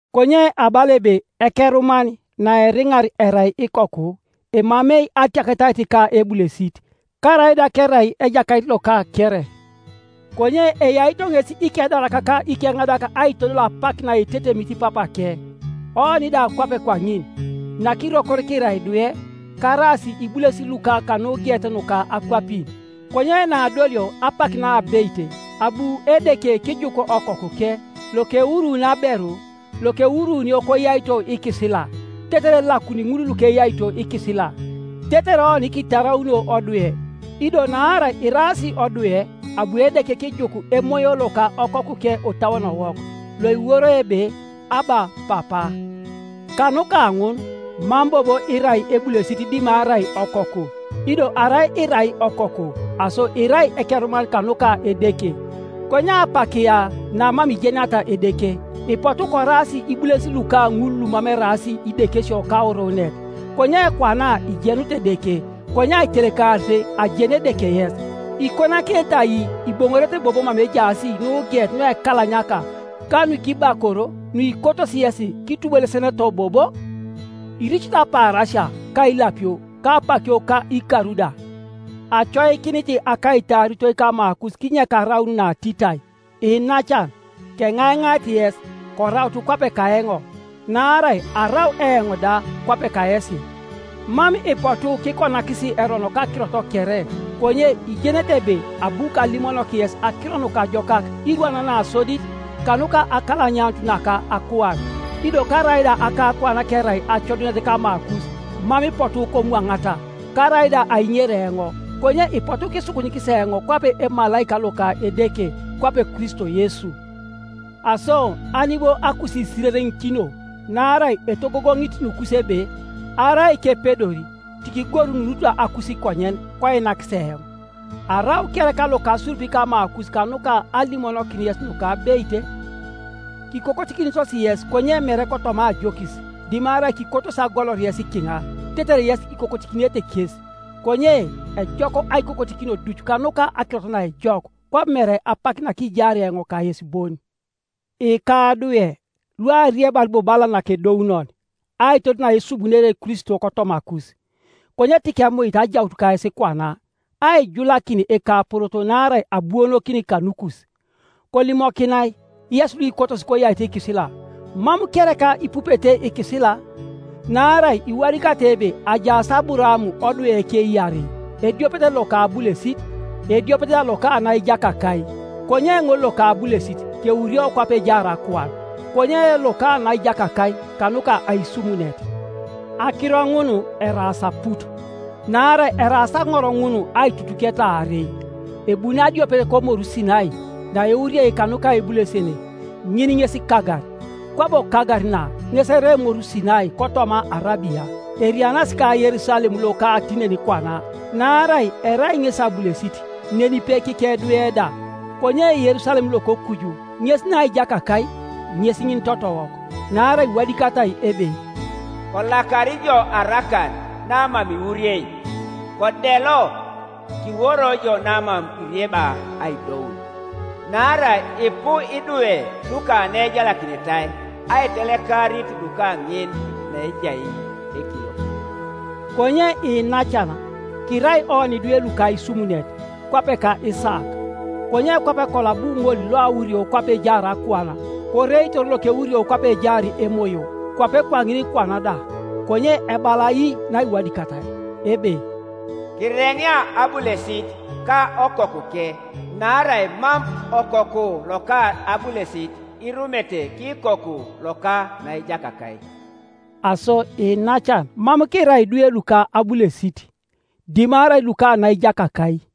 Konye abala ebe ekeruman naeriŋar erai ikoku, emamei atiaketait ka ebulesit, karaida kerai ejakait loka kere; konye eyaito ŋes ikedarak ka ikeŋadak aitodol apak naetetemit papake. Oni da kwape kwaŋin, nakirokor kirai idwe, karaas ibulesin luka kanugeet nuka akwapin. Konye naadolio apak naabeit, abu Edeke kijuk Okokuke, lokewuruuni aberu, lokewuruunio koyaito ikisila, tetere elakuni ŋul lukeyaito ikisila, tetere oni kitaraunio odwe, Ido naarai iraas odwe, abu Edeke kijuk Emoyo loka Okokuke otauonowok, loiworoi ebe, “Abba, Papa!” Kanuka ŋun mam bobo irai ebulesit dimarai okoku, ido arai irai okoku, aso irai ekeruman kanuka Edeke. Konye apak ya namam ijeniata Edeke, ipotu koraas ibulesin luka ŋul lumam eraas idekesio kauruunet; konye kwana ijenut Edeke, konye aitelekarit ajenu Edeke yes, ikonakinete ai iboŋorete bobo mama ejaas nugeet nuekalanyaka ka nukibakor nuikotosi yesi kitubulesenoto bobo? Iricito apaarasia, ka ilapio, ka apakio ka ikar da! Acoikinit akaitaaritoi kamakus kinyek araun natitai. Iinacan, keŋaiŋair yes, koraut kwape kaeoŋ, naarai arau eoŋ da kwape kayesi. Mam ipotu kikonakis erono kakirot kere; konye ijenete ebe abu kalimonok yes Akiro Nukajokak irwan nasodit kanuka akalanyanut naka akuan; ido karaida akakuan kerai acodunet kamakus, mam ipotu komwaŋata, karaida aiŋer eoŋ, konye ipotu kisukunyikis eoŋ kwape emalaika loka Edeke, kwape Kristo Yesu. Aso ani bo akusiisirereŋikino? Naarai etogogoŋit nukus ebe, arai kepedor tikigorununut akusikonyen, koinakis eoŋ. Arau kereka lokasurup kamakus kanuka alimonokin yes nukabeit? Kikokotikinitos yes konye mere kotoma ajokis, dimarai kikotos agolor yes kiŋa, tetere yes ikokotikinete kes. Konye ejok aikokotikinio duc kanuka akirot naejok, kwabo mere apak nakijaar eoŋ kayes bon. Ikadwe, luariebar bobo bala nakedounon, aitodol naesubunere Kristo kotomakus, konye tikemuit ajaut kayes kwana, aijulakin ekaporoto, naarai abuonokin kanukus. Kolimokinai, yes luikotos koyaito ikisila, mam kereka ipupete ikisila? Naarai iwadikatai ebe ajaas Aburaam odweke iarei, ediopet loka abulesit, ediopet da loka naijakakai. Konye ŋol loka abulesit keurio kwape ejaar akuan, konye loka naijakakai kanuka aisumunet. Akiro ŋun eraas aput: naarai eraas aŋor ŋun aitutuketa aarei. Ebuni adiopet komoru Sinai, naeuriei kanuka ebulesene, ŋin ŋes Kagar. Kwabo Kagar na ŋes erai emoru Sinai kotoma Arabia; erianas ka Yerusalem loka tinenikwana; naarai erai ŋesi abulesit nenipe kikedwe da. Konye Yerusalem lokokuju ŋes naijakakai, ŋes ŋin totowok. Naarai iwadikatai ebe, “Kolakar ijo arakan namam iwuriei, Kodelo, kiworo ijo namam irieba aidoun, Naarai ipu idwe luka naejalakinitai aitelekarit luka ŋin naejai ekiliokit.” Konye iinacan, kirai oni idwe luka aisumunet, kwape ka Isaak. Konye kwape kolo abu ŋol loawurio kwape ejaar akuan koreitor lokeurio kwape ejaar Emoyo, kwape kwaŋin kwana da. Konye ebala ai naiwadikatai? Ebe, “Kireŋea abulesit ka okokuke, naarai mam okoku loka abulesit irumete kikoku loka naijakakai.” Aso iinacan mam kirai idwe luka abulesit, dimarai luka naijakakai.